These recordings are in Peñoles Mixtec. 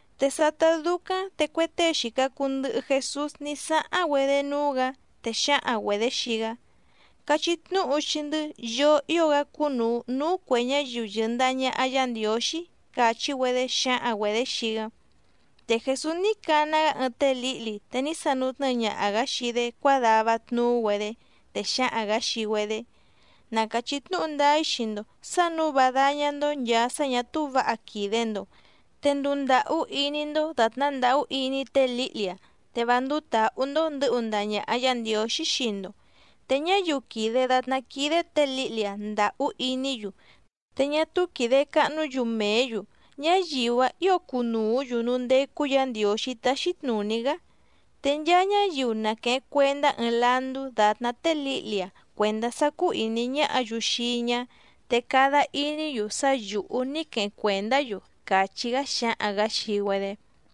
Te sátá dúcáⁿ te cue tée xìca cuu ndɨhɨ Jesús ní sáháⁿ‑güedé núú‑gǎ, te xǎhaⁿ‑güedě xii‑gá: —Cachí tnúhu xii‑ndɨ́, yoo ío‑gá cúnùu núú cuè ñáyiu yɨ̀ndaha ñaha Yá Ndiǒxí —càchí‑güedé xǎhaⁿ‑güedě xii‑gá. Te Jèsús ní cana‑gá ɨɨⁿ té lǐhli te ní sanutnɨ́ɨ ñaha‑gǎ xii‑dé cuádava tnuú‑güedé. Te xǎhaⁿ‑gǎ xii‑güedé: —Na càchí tnúhu ndáá‑í xii‑ndo sǎ nǔu vá dáñá‑ndó nchàa sá ñà túú vǎha quìde‑ndo, te nduu ndàhú iní‑ndó dàtná ndàhú iní té lǐhli‑a, te vá ndúú tǎhú‑ndó ndɨ̌hu ndaha ñàha Yá Ndiǒxí xii‑ndo. Te ñáyiu quìde datná quídé tě lǐhli‑a ndàhú iní‑yu, te ñá túú quìde cahnú‑yu mèé‑yu, ñáyiu‑áⁿ ǐo cunùú‑yu núú ndécú Yǎ Ndiǒxí táxí tnùní‑gá. Te nchaa ñáyiu na quèheⁿ cuendá ɨɨⁿ landú dàtná té lǐhli‑a cuèndá sá cúú ìní ñáhǎ‑yu xii‑í ñá, te cada iní‑yu sá yǔhú ní queheⁿ cuèndá‑yu —càchí‑gá xǎhaⁿ‑gǎ xii‑güedé.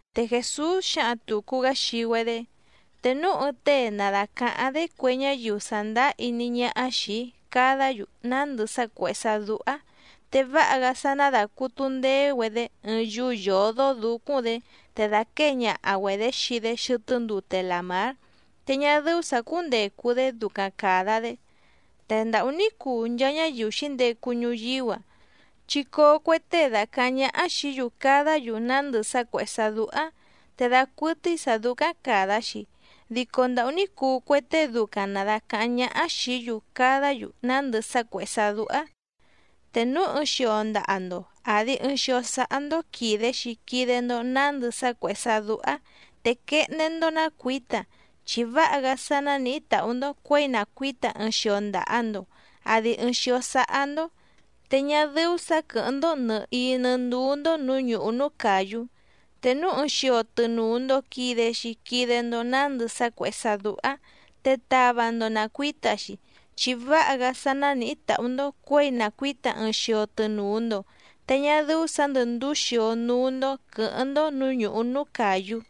Te Jèsús xǎhaⁿ tùcu‑gá xii‑güedé: —Te núu ɨɨⁿ tée na dàcaháⁿ‑dé cue ñáyiu sàndáá iní ñáhá xìi‑í cadá‑yu nándɨ sá cuèhé sá dúhá, te váha‑gá sá ná dàcutu ndeé‑güedé ɨɨⁿ yúú yǒdó dǔcúⁿ‑dě, te dàquée ñaha‑güedě xii‑dé xɨtɨ́ ndute làmár, te ñá dɨ́ú sǎ cúndècu‑dé ducaⁿ càda‑dé. ¡Te ndàhú ní cuu nchaa ñáyiu xǐndecu ñuyíú‑a, chi coo cue tée dacàháⁿ ñáhá xìí‑yu cadá‑yu nándɨ sá cuèhé sá dúhá te dacuɨtɨ́í sǎ dúcáⁿ càda‑xi! ¡Dico ndàhú ní cuu cue tée ducaⁿ na dàcaháⁿ ñáhá xìí‑yu cadá‑yu nándɨ sá cuèhé sá dúhá! ’Te núu ɨɨⁿ xio ndaha‑ndo àdi ɨɨⁿ xio sáhá‑ndó quìde‑xi quide‑ndo nándɨ sá cuèhé sá dúhá, te quehndé‑ndó ná cuǐta, chi váha‑gá sá nánìhí tàhú‑ndó cuěi na cuǐta ɨɨⁿ xio ndaha‑ndo àdi ɨɨⁿ xio sáhá‑ndó, te ñá dɨ́ú sǎ quɨ̀hɨ́ⁿ‑ndó nɨ̀hií nɨ́ ndúú‑ndó nǔú ñùhú núú càyú. Te núu ɨɨⁿ xio tɨnùu‑ndo quide‑xi quide‑ndo nándɨ sá cuèhé sá dúhá, te tava‑ndo na cuǐta‑xi, chi váha‑gá sá nánìhí tàhú‑ndó cuěi na cuǐta ɨɨⁿ xio tɨnùu‑ndo, te ñá dɨ́ú sǎ ndɨ̀ ndúú xio núú‑ndó quɨ̌hɨ́ⁿ‑ndó nǔú ñùhú núú càyú.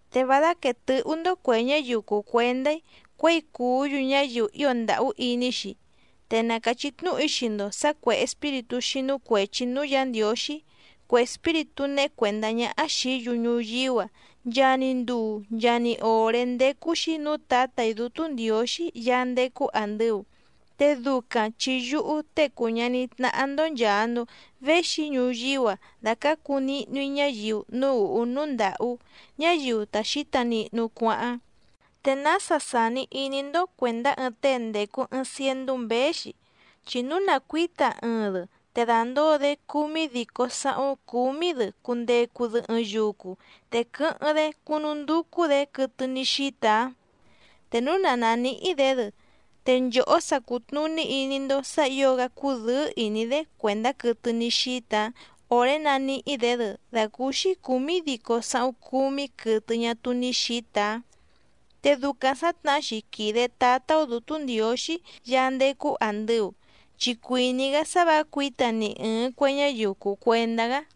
’Te vá dáquèe tɨhú‑ndó cuè ñáyiu cùu cuendá‑í cuěi cùú‑yu ñáyiu ío ndàhú iní‑xi. Te na càchí tnúhu‑í xii‑ndo sǎ cuè espíritú xínú cuèchi núú Yǎ Ndiǒxí, cue espíritú néhé cuèndá ñáhá xìí‑yu ñuyíú‑a, nchaa‑ni nduu nchaa‑ni òré ndécú‑xí nǔú Tǎtà‑í Dútú Ndiǒxí Yaá ndécú àndɨu. Te ducaⁿ chi yúhú Tée cùu ñaní tnáhá‑ndó nchàa‑ndo véxi‑í ñuyíú‑a dàcácu nihnu‑í ñáyiu núú ùhú núú ndàhú, ñáyiu ta xǐta nihnu cuáháⁿ. ’¿Te nása sàni iní‑ndó cuèndá ɨɨⁿ tée ndècu ɨɨⁿ ciendú mběé‑xi?, chi núu na cuǐta ɨɨⁿ‑dɨ te dàndóo‑dé cúmídícó sǎhúⁿ cúmí‑dɨ cundecu‑dɨ ɨɨⁿ yucu te quɨ́hɨ́ⁿ‑dé cúnúndúcú‑dě quɨtɨ ní xíta‑áⁿ. Te núu na nàníhí‑dě‑dɨ, te nchòhó sa cùtnuní iní‑ndó sǎ ǐo‑gá cudɨ́ɨ́ ìní‑dé cuèndá quɨtɨ ní xíta‑áⁿ òré naníhí‑dě‑dɨ dàcúúxí cǔmídícó sǎhúⁿ cúmí quɨtɨ ñá túú ní xǐta‑áⁿ. Te ducaⁿ sǎtnahá‑xi quìde Tátá‑ó Dǔtú Ndiǒxí Yaá ndécú àndɨu, chi cuìní‑gá sá vǎ cuǐta ni ɨ̀ɨⁿ cue ñáyiu cùu cuendá‑gá.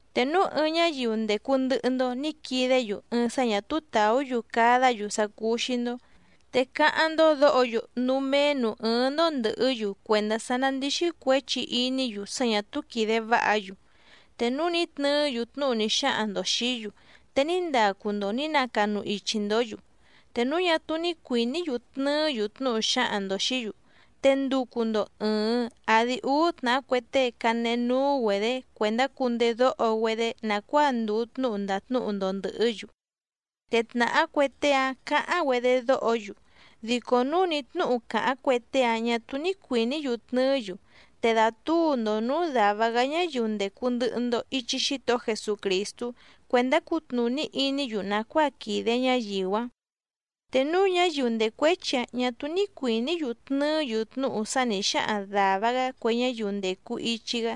’Te núu ɨɨⁿ ñáyiu ndècu ndɨhɨ‑ndo ní quidé‑yu ɨɨⁿ sá ñà túú tàú‑yu cadá‑yu sá cúú‑xí‑ndó, te cáháⁿ‑ndó dǒho‑yu núú méé nǔú ɨ́ɨ́ⁿ‑ndó ndɨ̀hɨ́‑yu cuèndá sá ná ndìxi cuéchi iní‑yu sá ñà túú quìde váha‑yu. Te núu ní tnɨɨ́‑yu tnúhu ní xáhaⁿ‑ndo xìí‑yu, te ní ndacu‑ndo nǐ nacanu ichi‑ndǒ‑yu. Te núu ñá túú ní cuìní‑yu tnɨɨ́‑yu tnúhu xǎhaⁿ‑ndo xìí‑yu, te nducu‑ndo ɨ̀ɨⁿ àdi úú tnàhá cue tée canehe núú‑güedě cuèndá cundedóho‑güedé nàcuáa ndùu tnúhu ndàtnúhu‑ndo ndɨ̀hɨ́‑yu. Te tnàhá cue tée‑áⁿ cǎháⁿ‑güedé dóho‑yu, dico núu ni tnǔhu càháⁿ cue tée‑áⁿ ñà túú ní cuìní‑yu tnɨɨ́‑yu, te dàtúu‑ndo nǔú dàva‑gá ñáyiu ndècu ndɨhɨ‑ndo ichi Xítohó Jesucrìstú cuèndá cutnùní iní‑yu nàcuáa quìde ñáyiu‑áⁿ. Te núu ñáyiu ndècuéchi‑áⁿ ñà túú ní cuìní‑yu tnɨɨ́‑yu tnúhu sá nǐ xáhaⁿ dàva‑gá cue ñáyiu ndècu ichi‑gá,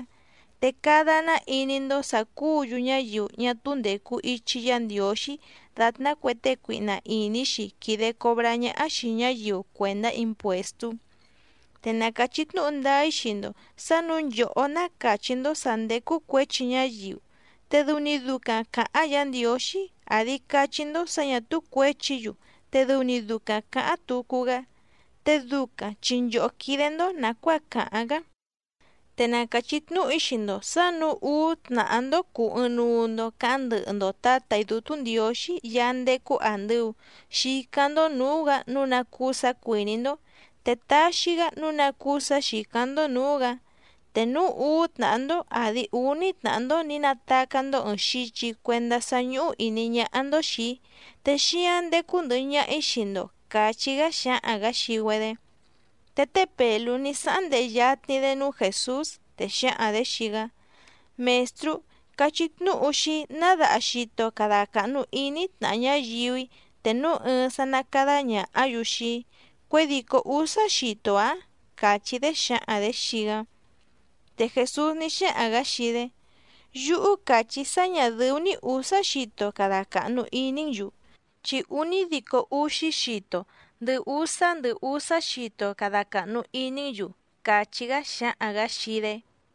te cada‑ná iní‑ndó sǎ cúǔ‑yu ñáyiu ñá túú ndècu ichi Yá Ndiǒxí dàtná cue tée cuihna ìní‑xi quìde cobrá ñáhá xìi ñáyiu cuèndá impuèstú. ’Te na càchí tnúhu ndáá‑í xii‑ndo sǎ nǔu nchòhó ná càchí‑ndó sǎ ndécú cuěchi ñáyiu, te dɨu‑ni ducaⁿ cǎháⁿ Yǎ Ndiǒxí, àdi cachí‑ndó sǎ ñà túú cuěchi‑yu te dɨu‑ni ducaⁿ cǎháⁿ tucu‑gá, te ducaⁿ chi nchòhó quídé‑ndó nàcuáa càháⁿ‑gá. ’Te na càchí tnúhu‑í xii‑ndo sǎ nǔu úú tnàhá‑ndó cùu ɨɨⁿnuu‑ndo caháⁿ ndɨhɨ‑ndo Tǎtà‑í Dútú Ndiǒxí Yaá ndécú àndɨu xicáⁿ‑ndó nǔú‑gǎ nǔu ná cúú sǎ cuìní‑ndó, te taxi‑gá nǔu ná cúú sǎ xìcáⁿ‑ndó nǔú‑gǎ. Te núu úú tnàhá‑ndó àdi úní tnàhá‑ndó nǐ natacá‑ndó ɨ̀ɨⁿ xichi cuendá sá ñúhú ìní ñáhá‑ndó xìi‑í, te xíáⁿ ndécú ndɨ̀hɨ ñaha‑í xii‑ndo —càchí‑gá xǎhaⁿ‑gǎ xii‑güedé. Te té Pèlú ní sáháⁿ ndehe yatni‑dé núú Jèsús, te xǎhaⁿ‑dě xii‑gá: —Mèstrú, cachí tnúhu xii‑í ná daha xito cada càhnu iní‑í tnàha ñáyiu‑í te núu ɨɨⁿ sá ná càda ñahá‑yu xii‑í. ¿Cuědìcó úsá xito‑ǎⁿ? —càchí‑dé xǎhaⁿ‑dě xii‑gá. Te Jèsús ní xáhaⁿ‑gǎ xii‑dé: —Yúhú càchí‑í sá ñà dɨ́ú‑ní ǔsá xito cada càhnu iní‑n‑yu, chi únídico úxí xito ndɨhɨ úsá ndɨhɨ úsá xito cada càhnu iní‑n‑yu —càchí‑gá xǎhaⁿ‑gǎ xii‑dé.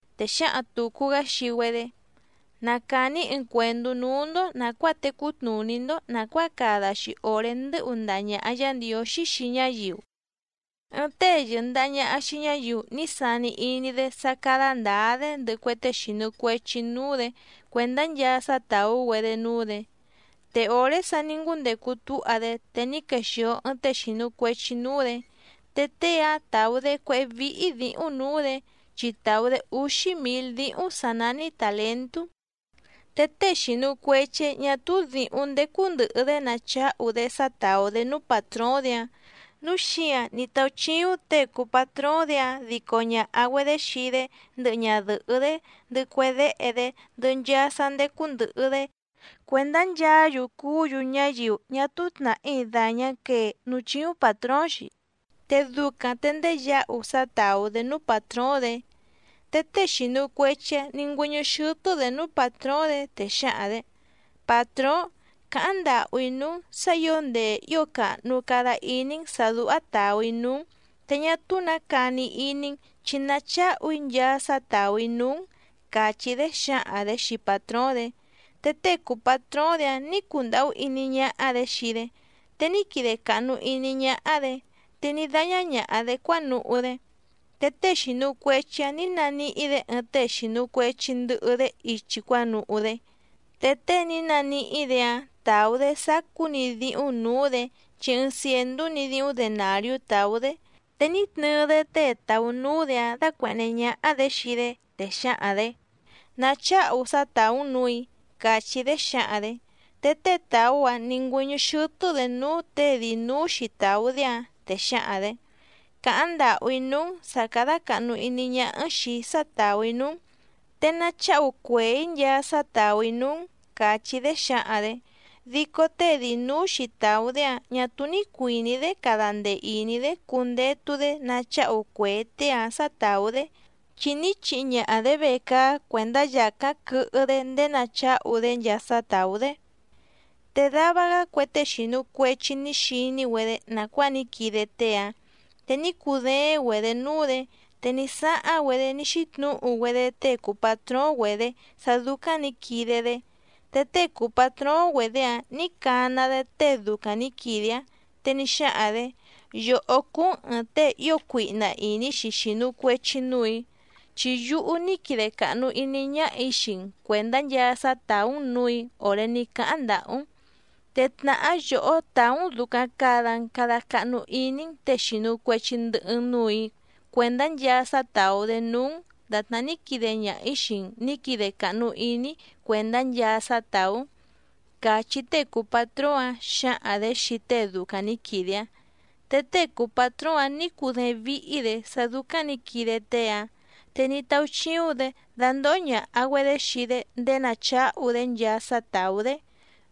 Te xǎhaⁿ tùcu‑gá xii‑güedé: —Na càni‑í ɨɨⁿ cuèndú núú‑ndó nàcuáa tecú tnùní‑ndó nàcuáa cada‑xi òré ndɨ́hu ndaha ñàha Yá Ndiǒxí xii ñáyiu. Ɨɨⁿ tée yɨ̀ndaha ñaha xii ñáyiu ní sani iní‑dé sá cádá ndǎá‑dé ndɨhɨ cue tée xìnu cuechi núú‑dě cuèndá nchaa sá tàú‑güedé núú‑dě. Te òré sa ní ngúndecu túha‑dé te ní quexìo ɨɨⁿ tée xìnu cuechi núú‑dě. Te tée‑áⁿ tàú‑dé cuéhé víhí dǐhúⁿ nǔú‑dě, chi tàú‑dé úxí mǐl díhúⁿ sǎ nání tàlentú. Te tée xìnu cuechi‑áⁿ ñà túú dǐhúⁿ ndécú ndɨ̀hɨ‑dé nacháhu‑dé sá tàú‑dé núú pàtróóⁿ‑dě‑áⁿ, núu xíǎⁿ ní táúchíúⁿ těe cùu patróóⁿ‑dě‑áⁿ dico ñàha‑güedé xii‑dé ndɨhɨ ñadɨ̀hɨ́‑dé ndɨhɨ cue déhe‑dé ndɨhɨ nchaa sá ndécú ndɨ̀hɨ‑dé cuèndá nchaá‑yu cuú‑yu ñáyiu ñá túú tnàhí dàñá quee núú chíúⁿ pàtróóⁿ‑xi, te ducaⁿ te ndéyǎhu sá tàú‑dé núú pàtróóⁿ‑dě. Te tée xìnu cuechi‑áⁿ nǐ ngüɨ́ñɨ́ xɨ́tɨ́‑dě núú pàtróóⁿ‑dě, te xǎhaⁿ‑dě: “Pàtróóⁿ, càháⁿ ndàhú‑í núú‑n sǎ ǐo ndee ǐo càhnu cada iní‑n sǎ dúhá tàú‑í núú‑n, te ñá túú nǎ cani iní‑n chi nacháhu‑í nchaa sá tàú‑í núú‑n”, càchí‑dé xǎhaⁿ‑dě xii pàtróóⁿ‑dě. Te tée cùu patróóⁿ‑dě‑áⁿ nǐ cundàhú iní ñáhá‑dě xii‑dé, te ní quide càhnu iní ñáhá‑dě, te ní dáñá ñàha‑dé cuánuhú‑dé. Te tée xìnu cuechi‑áⁿ nǐ naníhí‑dě ɨɨⁿ tée xìnu cuechi ndɨhɨ‑dé ichi cuánuhú‑dé, te tée ní naníhí‑dě‑áⁿ tàú‑dé sacú‑ni díhúⁿ nǔú‑dě chi ɨɨⁿ cièndú‑ni díhúⁿ denàriú tàú‑dé. Te ní tnɨɨ‑dé tée tàú núú‑dě‑áⁿ dácuèhné ñáhá‑dě xii‑dé, te xǎhaⁿ‑dě: “Nacháhu sá tàú‑n nǔù‑í”, càchí‑dé xǎhaⁿ‑dě. Te tée tàú‑áⁿ nǐ ngüɨ́ñɨ́ xɨ́tɨ́‑dě núú těe dii nǔú‑xi tàú‑dé‑áⁿ, te xǎhaⁿ‑dě: “Càháⁿ ndàhú‑í núú‑n sǎ cádá càhnu iní ñáhá‑n xìi‑í sá tàú‑í núú‑n, te nacháhu cuèé‑í nchaa sá tàú‑í núú‑n”, càchí‑dé xǎhaⁿ‑dě. Dico tée dii nǔú‑xi tàú‑dé‑áⁿ ñà túú ní cuìní‑dé cada ndee ìní‑dé cundetu‑dé nacháhu cuèé tée‑áⁿ sǎ tàú‑dé, chi ní chihi ñaha‑dě vecaá cuèndá yàcáⁿ quɨhɨ‑dé ndéé nacháhu‑dé nchaa sá tàú‑dé. Te dava‑gá cue tée xìnu cuechi ní xiní‑güedé nàcuáa ní quide tée‑áⁿ, te ní cudééⁿ‑güedě núú‑dě, te ní sáháⁿ‑güedé ní xítnǔhu‑güedé tée cùu patróóⁿ‑güedě sá dúcáⁿ nǐ quide‑dé. Te tée cùu patróóⁿ‑güedě‑áⁿ nǐ cana‑dé tée ducaⁿ nǐ quide‑áⁿ, te ní xáhaⁿ‑dě: “Yòhó cúú‑n ɨ̀ɨⁿ tée ío cuihna ìní‑xi xìnu cuechi núù‑í, chi yúhú ní quide càhnu iní ñáhà‑í xii‑n cuèndá nchaa sá tàú‑n nǔù‑í òré ní cáháⁿ ndàhú‑n. Te tnàhá yòhó tàú‑n dùcaⁿ cada‑n cada cahnu iní‑n těe xìnu cuechi ndɨhɨ‑n núù‑í cuèndá nchaa sá tàú‑dé núú‑n dàtná ní quide ñaha‑ǐ xii‑n nǐ quide càhnu iní‑í cuèndá nchaa sá tàú‑n”, càchí tée cùu patróóⁿ‑áⁿ xǎhaⁿ‑dě xii tée ducaⁿ nǐ quide‑áⁿ. Te tée cùu patróóⁿ‑áⁿ nǐ cudééⁿ víhí‑dě sá dúcáⁿ nǐ quide tée‑áⁿ, te ní táúchíúⁿ‑dě dandòho ñaha‑güedé xii‑dé ndéé nacháhu‑dé nchaa sá tàú‑dé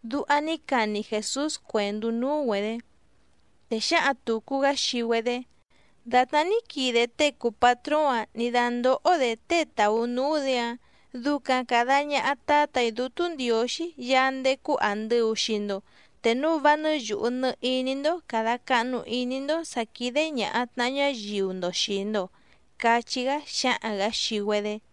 —duha ní cani Jèsús cuèndú núú‑güedě. Te xǎhaⁿ tùcu‑gá xii‑güedé: —Dàtná ní quide tée cùu patróóⁿ‑ǎⁿ nǐ dándóhó‑dě tée tàú núú‑dě‑áⁿ ducaⁿ càda ñaha Tátà‑í Dútú Ndiǒxí Yaá ndécú àndɨu xii‑ndo, te núu vá nɨ́ yùhu nɨ iní‑ndó càda cahnu iní‑ndó sǎ quídé ñàha tnaha ñáyiu‑ndo xìi‑ndo —cachí‑gá xǎhaⁿ‑gǎ xii‑güedé.